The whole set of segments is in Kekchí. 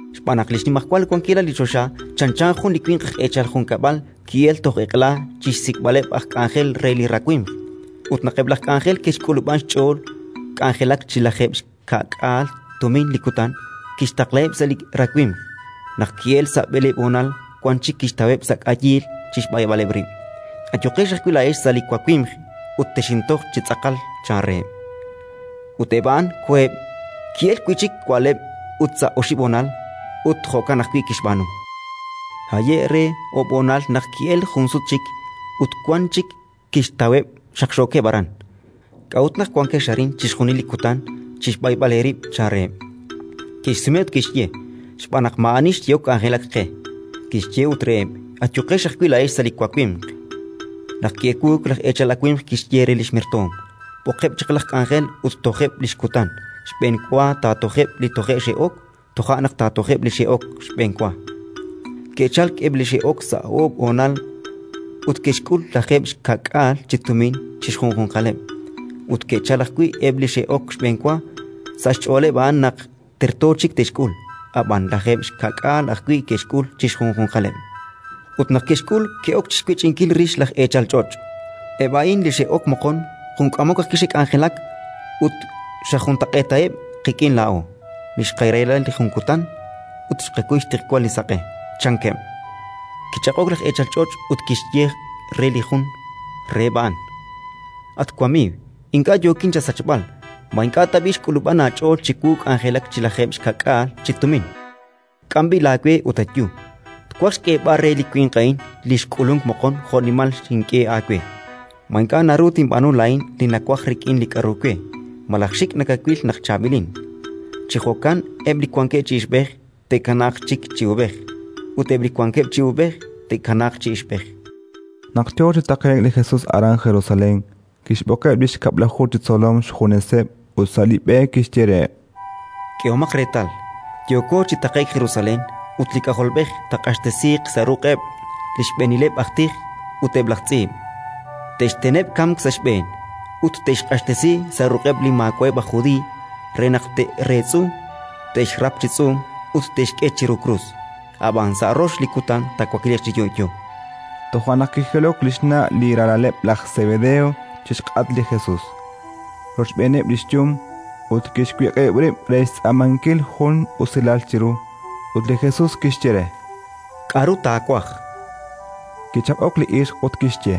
“Xb'aan naq li xnimajwal wankilal li choxa chanchan jun li winq aj eechal junkab'al li ki'elk toj eq'la chi xsik'b'aleb' aj k'anjel re li rawimq. Ut naq eb' laj k'anjel ke'xk'ulub'an xch'ool k'anjelak chi lajeeb' xka'k'aal tumin li kutan, kixtaqlaheb' sa' li rawimq. Naq ki'elk sa' b'eleeb' honal, wank chik kixtaweb' sa' k'ayiil chi xb'ayb'aleb' rib': «Ayuqex ajwi' laa'ex sa' li wawimq, ut texintoj chi tz'aqal», chan reheb'. Ut eb' a'an koheb'. Ki'elk wi' chik wa'leb' ut sa' oxib' honal, ut jo'kan ajwi' kixb'aanu. Haye'k re oob' honal naq ki'elk jun sut chik, ut wan chik kixtaweb' xaqxookeb' aran: «K'a'ut naq wankex arin chixjunil li kutan chi xb'ayb'al eerib'?», chan reheb'. Ke'xsume ut ke'xye: Xb'aan naq maa'ani xyehok k'anjelak qe. Kixye ut reheb': «Ayuqex ajwi' laa'ex sa' li wawimq». “Naq ki'ewuuk, laj eechal awimq kixye re li xmertoom: «B'oqeb' chaq laj k'anjel ut tojeb' li xkutan: xb'enwa taatojeb' li toje' xe'ok, toja' naq taatojeb' li xe'ok xb'enwa». Ke'chalk eb' li xe'ok sa' oob' honal ut ke'xk'ul lajeeb' xka'k'aal chi tumin chi xjunjunqaleb'. Ke'chalk ajwi' eb' li xe'ok xb'enwa: sa' xch'ooleb' a'an naq terto chik te'xk'ul; ab'an lajeeb' xka'k'aal ajwi' ke'xk'ul chi xjunjunqaleb'. Ut naq ke'xk'ul, ke'ok chi xwech'inkil rix laj eechal ch'och': «Eb' a'in li xe'ok moqon jun k'amok ajwi' xe'k'anjelak, ut xajuntaq'eetaheb' qik'in laa'o li xqarahila li kutan ut xqakuy xtiqwal li saq'e», chankeb'. Kichaq'ok laj eechal ch'och' ut kixye re jun reheb' a'an: «At wamiiw, ink'a' yookin chasachb'al. Ma ink'a' tab'i' xk'ulub'an aach'ool chiwu k'anjelak chi lajeeb' xka'k'aal chi tumin? K'am b'i' laawe ut ayu. Twaj xk'eeb'al re li winq a'in li xk'ulunk moqon jo'nimal xink'e aawe. Ma ink'a' naru tinb'aanu laa'in li nawaj rik'in li k'aru we? Malaj xik' nakawil naq chaab'ilin?». “Chi jo'kan eb' li wankeb' chi ixb'ej, te'kanaaq chik chi uub'ej, ut eb' li wankeb' chi uub'ej, te'kanaaq chi ixb'ej”. Naq yo chi taqe'k li Jesus aran Jerusalén, kixb'oqeb' li xkab'laju chi tzolom xjuneseb' ut sa' li b'e kixye reheb': —K'ehomaq reetal, yooko chi taqe'k Jerusalén, ut li K'ajolb'ej taaq'axtesiiq sa' ruq'eb' li xb'eenileb' aj tij ut eb' laj tz'iib'. Te'xteneb' kamk sa' xb'een ut te'xq'axtesi sa' ruq'eb' li maawa'eb' aj Judiiy re naq te'reetz'u, te'xrap chi tz'uum ut te'xk'e chiru krus; ab'an sa' rox li kutan taawakliiq chi yo'yo. Toja' naq kijilok li xna' li ralaleb' laj Sebedeo chi xk'atq li Jesus, rochb'eeneb' li xyum, ut kixwiq'ib' rib' re xtz'aamankil jun usilal chiru. Ut li Jesus kixye re: —K'aru taawaj? Kichaq'ok li ixq ut kixye: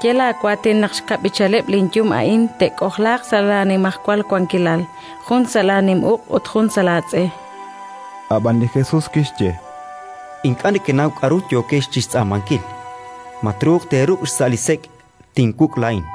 —Ye laawaatin naq xkab'ichaleb' linyum a'in te'k'ojlaaq sa' laanimajwal wankilal, jun sa' laanim uq' ut jun sa' laatz'e. Ab'an li Jesus kixye: —Ink'a' nekenaw k'aru yookex chi xtz'aamankil. Ma truuq teeruk' xsa' li sek' tinwuk' laa'in?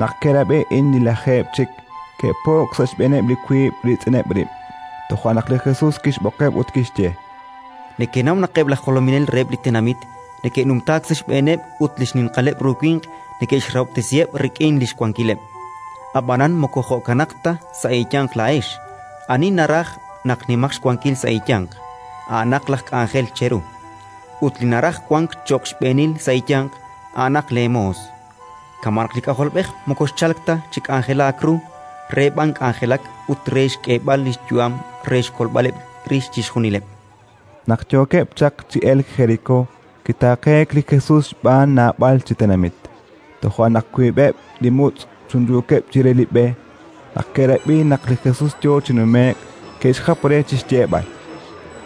Naq ke'rab'i a'in li lajeeb' chik, ke'po'k sa' xb'eeneb' li wiib' riitz'ineb' rib'. Toja' naq li Jesus kixb'oqeb' ut kixye: —Nekenaw naq eb' laj jolominel reheb' li tenamit neke'numtaak sa' xb'eeneb' ut li xninqaleb' ru winq neke'xrahob'tesiheb' rik'in li xwankileb'. Ab'anan moko jo'kanaq ta sa' eeyanq laa'ex: ani naraj naq nimaq xwankil sa' eeyanq, a'anaq laj k'anjel cheru, ut li naraj wank cho'q xb'eenil sa' eeyanq, a'anaq leemoos. Kama' naq li K'ajolb'ej moko xchalk ta chi k'anjelaak ru, re b'an k'anjelak ut re xk'eeb'al li xyu'am re xkolb'aleb' rix chixjunileb'. Naq yookeb' chaq chi elk Jerikó, kitaaqeek li Jesus xb'aan naab'al chi tenamit. Toja' naq wiib'eb' li mutz' chunchuukeb' chire li b'e, naq ke'rab'i naq li Jesus yo chi numeek, ke'xjap re chi xyeeb'al: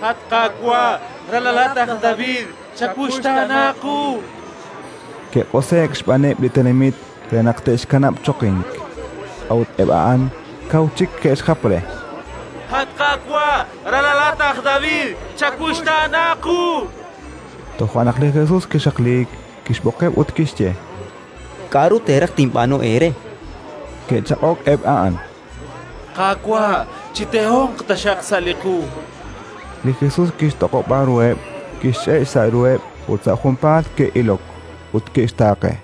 —At Qaawa', ralalat laj David, chawuxtaana qu! Ke'q'use'k xb'aaneb' li tenamit re naq te'xkanab' choqink; a'ut eb' a'an kaw chik ke'xjap re: —At Qaawa', ralalat laj David, chawuxtaana qu! chankeb'. Toja' naq li Jesus kixaqliik, kixb'oqeb' ut kixye: —K'aru teeraj tinb'aanu eere? Ke'chaq'ok eb' a'an: —Qaawa', chitehonq taxaq xsa' li qu! chankeb'. Li Jesus kixtoq'ob'a ruheb', kixch'e' xsa' ruheb', ut sa' junpaat ke'ilok; ut ke'xtaaqe.